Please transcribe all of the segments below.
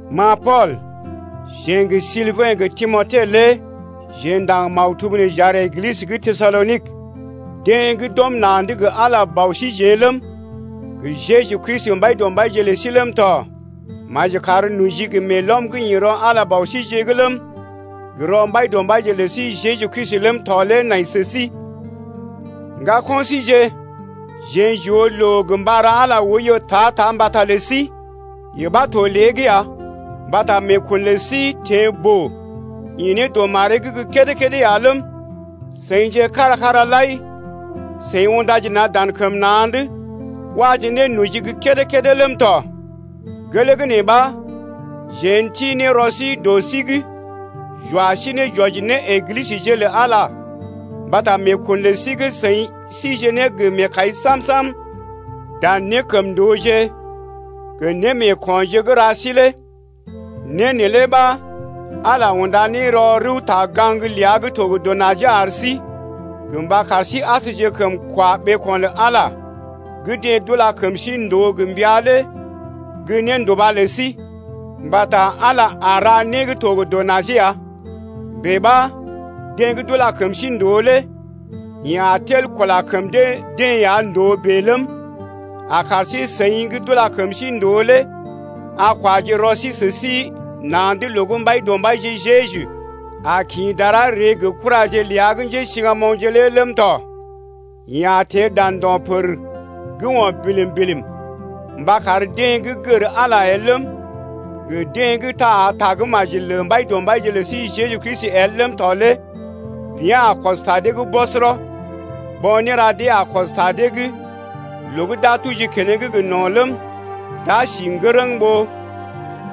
Ma Pool, jeḛ gə Silbɛ̰ gə Timote lé jeḛ ndaŋg maktub nee j’ar Eglisə gə́ Tesalonik, deḛ gə́ d’ɔm na̰’d gə Ala Bɔ síjeḛ ləm, gə Jeju Kristi Mbaidɔmbaije ləm tɔ. Maji kar noji gə meelɔm gə́ ḭ rɔ Ala Bausijeḛ’g ləm, gə rɔ Mbaidɔmbaije lə sí Jeju Kristi’g ləm tɔ lé nai sə sí. Ŋgako̰ síje, jeḛ j’oo loo gə mba ra Ala oiyo ta-ta mbata lə sí, yee ɓa to lée’g ya, mbata meekun lə sí teḛ boo, ḭ ne dɔ maree’g gə́ kédé-kédé ya ləm, seḭje kára kara lai seḭ undaje na̰ dan kəm na̰’d waje ne noji gə́ kédé-kédé ləm tɔ. Gelee gə́ nee ɓa, jeḛ n’ti ne rɔ sí dɔ sí’g j’wa sí ne j’wɔji ne Eglisəje lə Ala mbata meekun lə sí gə́ seḭ síje ne gə meekai sam-sam dan nékəmndooje gə némeekonje gə́ ra sí lé. Né neelé ɓa Ala unda ne rɔ rəwta-gaŋg ləa gə́ to gə dɔ najee ar sí, gə mba kar sí asjekəm kwa ɓeeko̰ lə Ala gə́ deḛ d’ula kəm sí ndòo gə mbəa lé gə́ nénduba lə sí. Mbata Ala a ra né gə́ to gə dɔ najee ya, bèe ɓa deḛ gə́ d’ula kəm sí ndòo lé yeḛ a tel kula kəm dee-deḛ ya ndòo bèe ləm, a kar sí-seḭ gə́ d’ula kəm sí ndòo lé a kwaje rɔ sí sə sí na̰’d loo gə́ Mbaidɔmbaije Jeju a kḭ dara ree gə kuraje ləa gə́ njésiŋgamoŋje lé ləm tɔ. Yeḛ a teḛ dan ndo̰ pər gə́ o̰ bilim-bilim mba kar deḛ gə́ gər Ala el ləm, gə deḛ gə́ taa tagə́maji lə Mbaidɔmbaije lə sí Jeju Kristi el ləm tɔ lé bea̰ a kɔs ta dee’g bɔsɔrɔ. Bo̰ néra dee a kɔs ta dee’g loo gə́ d’a tuji keneŋ gə no̰ ləm, d’a si ŋgərəŋ ɓó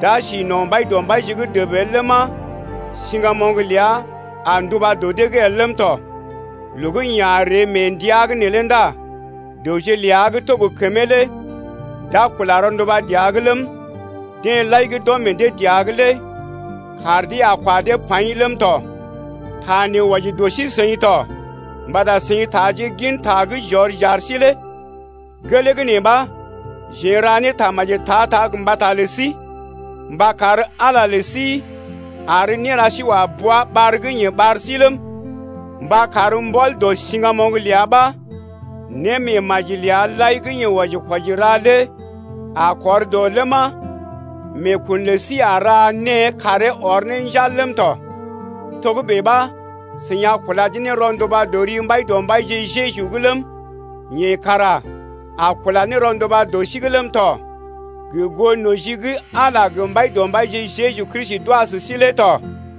d’a si no̰ Mbaidɔmbaije’g dəb el ləma, siŋgamoŋ ləa a nduba dɔ dee’g el ləm tɔ. Loo gə́ yeḛ a ree mee ndəa’g neelé ndá dəwje ləa gə́ to gə kəmee lé d’a kula rɔnduba dəa’g ləm, deḛ lai gə́ d’ɔm meḛ dee dəa’g lé kaar dee a kwa dee paḭ ləm tɔ. Ta nee wɔji dɔ sí-seḭ to mbata seḭ taaje gin ta gə́ j’ɔr j’ar sí lé. Gelee gə́ nee ɓa, jeḛ n’ra ne tamaji ta-ta mbata lə sí mba kar Ala lə sí ar néra sí wa bua ɓar gə́ yeḛ ɓar sí ləm, mba kar mbɔl dɔ siŋgamoŋ ləa ɓa némeemajije ləa lai gə́ yeḛ wɔji-kwɔji ra lé a kɔr dɔ njal ləma, meekun lə sí a ra née karee ɔr ne njal ləm tɔ. Togə́bè ɓa, seḭ a kulaje ne rɔnduba dɔ ri Mbaidɔmbaije Jeju’g ləm, yeḛ kara a kula ne rɔnduba dɔ sí’g ləm tɔ, gə goo noji gə́ Ala gə Mbaidɔmbaije Jeju Kristi d’wa sə sí lé tɔ.